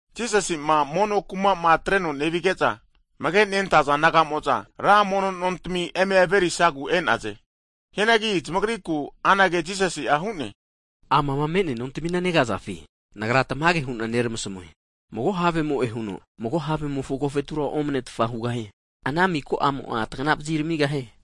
Jisasi'ma mono kuma'ma atreno nevige'za, amage'ma nentaza disaipol nagamo'za ra mono nontami eme averisagu e'naze. Hianagi zamagriku anage Jisasi'a hu'ne, amama me'nea nontamina negazafi? Nagra tamage hu'na neramasmue, mago havemo'e huno mago havemofo agofetura omanetfa hugahie. Ana miko'mo'a tagnavazi ramigahie.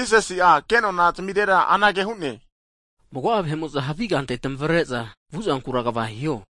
Jisasi'a ke'nona zamirera anage hu'ne, mago'a vahe'mo'za havi kante tmavare'za vuzankura kva hiho.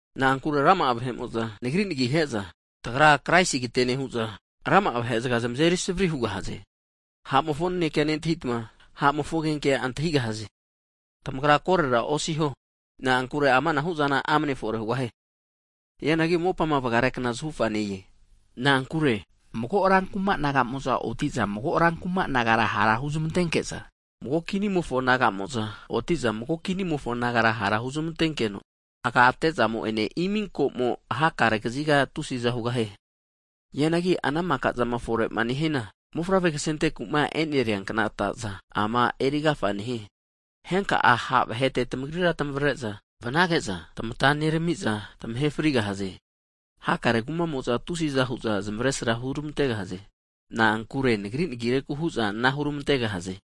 Na'ankure rama'a vahe'mo'za, Nagri nagihe'za, tagra kraisigate nehu'za rama'a vahe'zga zmazeri savri hugahaze. Ha'mofo nanekea nentahitma, ha'mofo agigenkea antahigahazanagi tamagra korera osiho. Na'ankure amanahu'zana amne fore hugahie. Hianagi mopa vgarekna zahufa ne-e. Na'ankure mago rankuma nagamo'za, oti'za mago rankuma nagara ha' huzmantenkeno, mago kini ne'mofo nagamo'za otino mago kini nemofo nagara hara huzmantenkeno, agate'zamo ene iminkomo hakare kaziga tusi'za hugahie. Hianagi ana maka zama fore haniana, mofavre ksenteku'ma eneria kna ataza ama erigafa nehie. Henka'a, ha' vahete tmagrira tamavare'za vnage'za tamata neramiza tamahe frigahaze. Hakare kuma'mo'za tusi'za hu'za zmavesra huramantegahaze. Na'ankure Nagri nagireku hu'za ana huramantegahaze.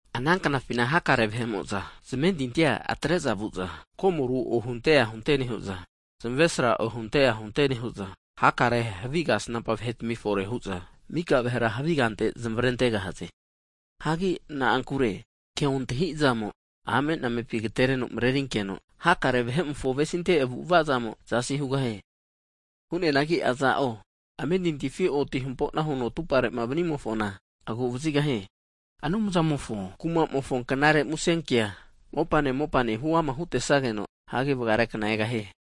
Ana knafina hakare'mo'za zmentintia atre'za vu'za, komoru ohunte ahunte nehu'za, zamavesra ohunte ahunte nehu'za, hakare havi kasnampa vahetami fore hu'za mika vahera havigante zmarentegahaze. Hagi na'ankure ke ontahi'zamo'a ame'namepi agatereno marenerinkeno, hakare vahe'mofo avesinte avu'avazamo zasi hugahie. Hu'neanagi aza'o amentintifima oti hampo'nama huno atupare'ma vanimofona aguvazigahie. Anumzamofo kuma'mofo knare musenkea mopane mopane huama hutesageno, hagi vgarekna egahie.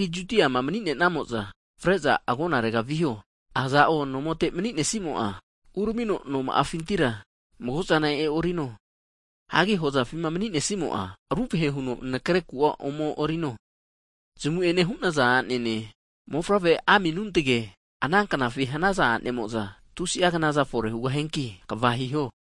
Hagi Judiama mni'namo'za fre'za agonarega viho. Aza'o nomote mni'nesimo'a, uramino noma'afintira mago'zana e'orino. Hagi hozafima mni'nesimo'a ruvahe huno nakre ku'a ome e'orino. Zamu'ene hu'naza a'nene, mofavre aminuntage ana knafi hanaza a'nemo'za, tusi'a knaza fore hugahianki kva hiho.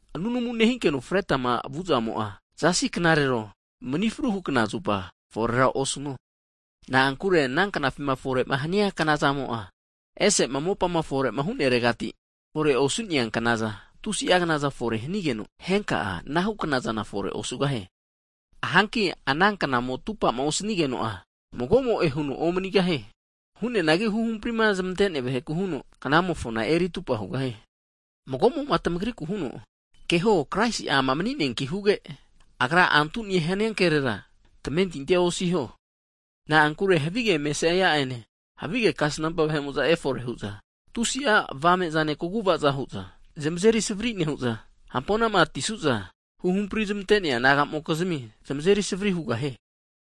Nunamu nehinkeno fretma vuzamo'a, zasi knarero manifruhu knazupa (sabat) fore osino. Na'ankure ana knafima fore'ma hania knazamo'a, ese'ma mopa fore'ma huneregati fore osu'nea knaknaza tusi'a knaza fore hanigeno, henka'a anahu knazana fore osugahie. Hanki ana knamo atupama osanigeno'a, magomo'e huno omanigahie. Hu'neanagi huhampri zmante'nea vaheku huno knamofona eritupa hugahie. Mago'mo'ma tamagriku huno, keho, Kraisi'a amananki huge, Agra antune hania kerera tamentinti osiho. Na'ankure havige kraisi'a ene, havige kasnampa vahemo'za efore hu'za, tusi'a avame'zane kaguva'za hu'za zmazeri savari nehu'za, hampo'nama atisu'za, Anumzamo'ma huhampri'zmante namokizmia zmazeri savari hugahie.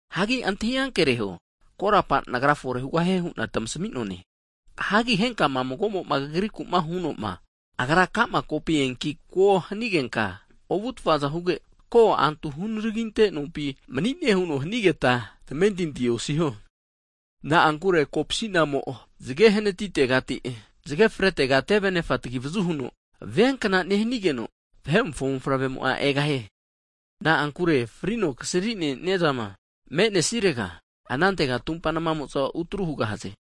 Hagi antahi ankereho, korapa Nagra fore hugahie hu'na tmasmi'noane. Hagi henka'ma mago'mo kagriku hunoma, Agra ka'ma kopi eanki ko hanigenka ovutfa huge, ko, antu hunaraginte nompi mni'ne huno hanigeta, tamentinti osiho. Na'ankure kopsi'namo zge hanatitegati zge fretega tevenefa tagivazu huno viankna nehanigeno, Vahe'mofo mofavrea egahie. Na'ankure frino kasrine'niazama me'nesirega, anantega tumpa nmamo'za utru hugahaze.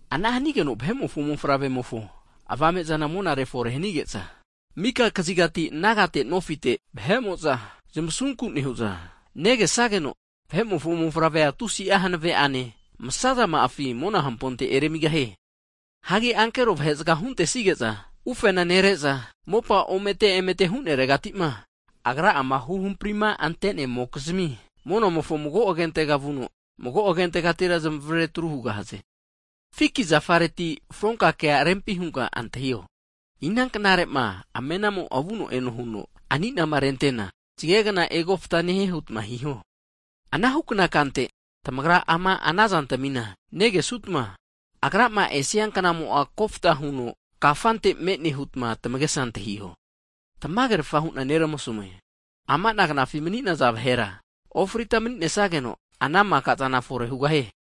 Ana hanigeno Vahe'mofo Mofavremofo avame'zana monare fore hanige'za, mika kazigati nagate nofite vahe'mo'za zmasunku nehu'za negesageno, Vahe'mofo Mofavre'a tusi'a hanave' ane masazama'afi mona hamponte eramigahie. Hagi ankero vahe'zga'a huntesige'za ufena nere'za, mopa omete emete huneregati'ma Agrama huhampri'ma zmante'nemokizmi, monamofo mago agentega vuno mago agentegatira zmavare atru hugahaze. Fiki zafareti fronka kea rempi hunka antahio, knare huno amena'mo vuno eno huno ani'nama erimarena, zgegna egofta nehie hutma hiho. Anahu kna kante, tamagra ma ama ana zantmima negesutma, Agrama esia knamo'a kofta huno kafantfante me'ne hutma tamagesa antahiho. Tamagerafa hu'na Nagra neramasmue. Ama knafima mni'naza vahera ofrita mni'nesageno, ana mika'zana fore hugahie.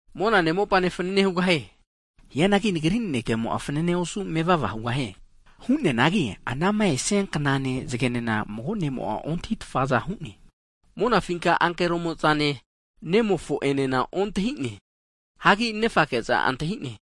Monane mopanena fanane hugahie. Hianagi Nagri nanekemo'a fanane osu mevava hugahie. Hu'neanagi anama esia knane zgenena, mago nemo'a ontahi'tfaza hu'ne. Monafinka ankeromo'zane Nemofo'enena ontahine. Hagi Nenfake'za antahi'ne.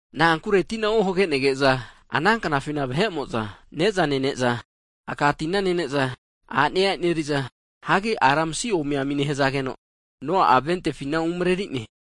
Na'ankure tina ohage'nege'za, ana knafina, vahe'mo'za nezana nene'za, aka tina nene'za, a'nea e'neriza, ara masi omiami nehazage'no, Noa'a ventefina umreri'ne.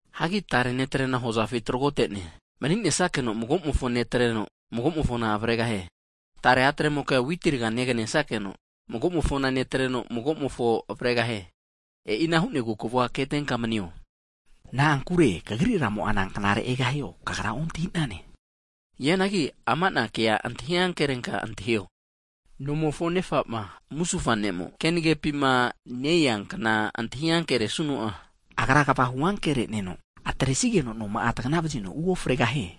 Hagi tare ne'trena hozafi tragote'ne mni'nesnakeno mago'mofo netreno, mago'mofona avregahie. Tare a'tremoke'a witi rga neganesakeno, mago'mofona netreno mago'mofo avregahie. E'ina hu'negu kavua ketenka manio, na'ankure kagri Ramo'a nanknare egahio, kagra ontahi'nane. Hianagi ama'na kea antahi ankerenka antahio, nomofo nefa'ma musufa ne'mo kenagepima ne-esia knama antahi ankere'nesuno'a, agra kvahu ankere'ne'no atresigeno noma'a tapagana vazino uofregahie.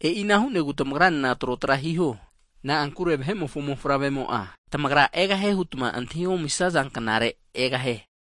E'ina hu'negu tamagra nena trotra hiho, na'ankure Vahe'mofo mofavremo'a tamagra egahie hutma antahi omisaza knazupa egahie.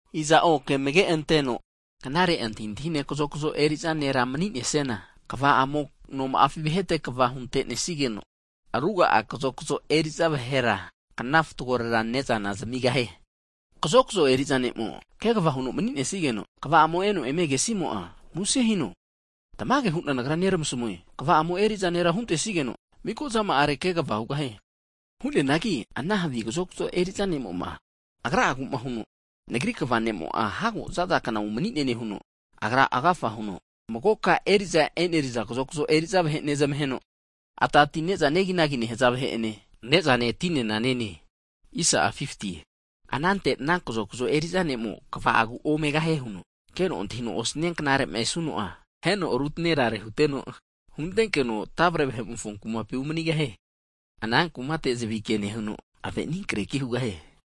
Aza'o ke amage'anteno knare antahintahine kazokzo eriza ne'ma mni'nesiana, kva'amo noma'afi vahete kva hunte'nesigeno, ruga'a kazokzo eriza vahera knafatgorera ne'zana zamigahie. Kazokzo eriza ne'mo kegva huno mni'nesigeno, kva'amo eno emegesimo'a muse hino. Tamage hu'na Nagra neramasmue, kva'amo eri'za nera huntesigeno, miko zama'arera kegva hugahie. Hu'neanagi ana havi kazokzo eriza nemo'ma agragu'ma huno, Nagri kva ne'mo'a hago zaza kna umanie nehuno, agra agafa huno, magoka eri'za e'neriza kazokzo eri'za vahe nezmaheno, aka ti ne'za neginagi nehaza vahe'ene ne'zane, tinena ne'ne. Anante ana kazokzo eri'za ne'mo kva'agu omegahie huno, keno antahino osnia knare'ma esuno'a, aheno rutnerare huteno, huntenkeno tavre vahe'mofo kumapi umanigahie. Ana kumate zavike nehuno, ave' aninkreki hugahie.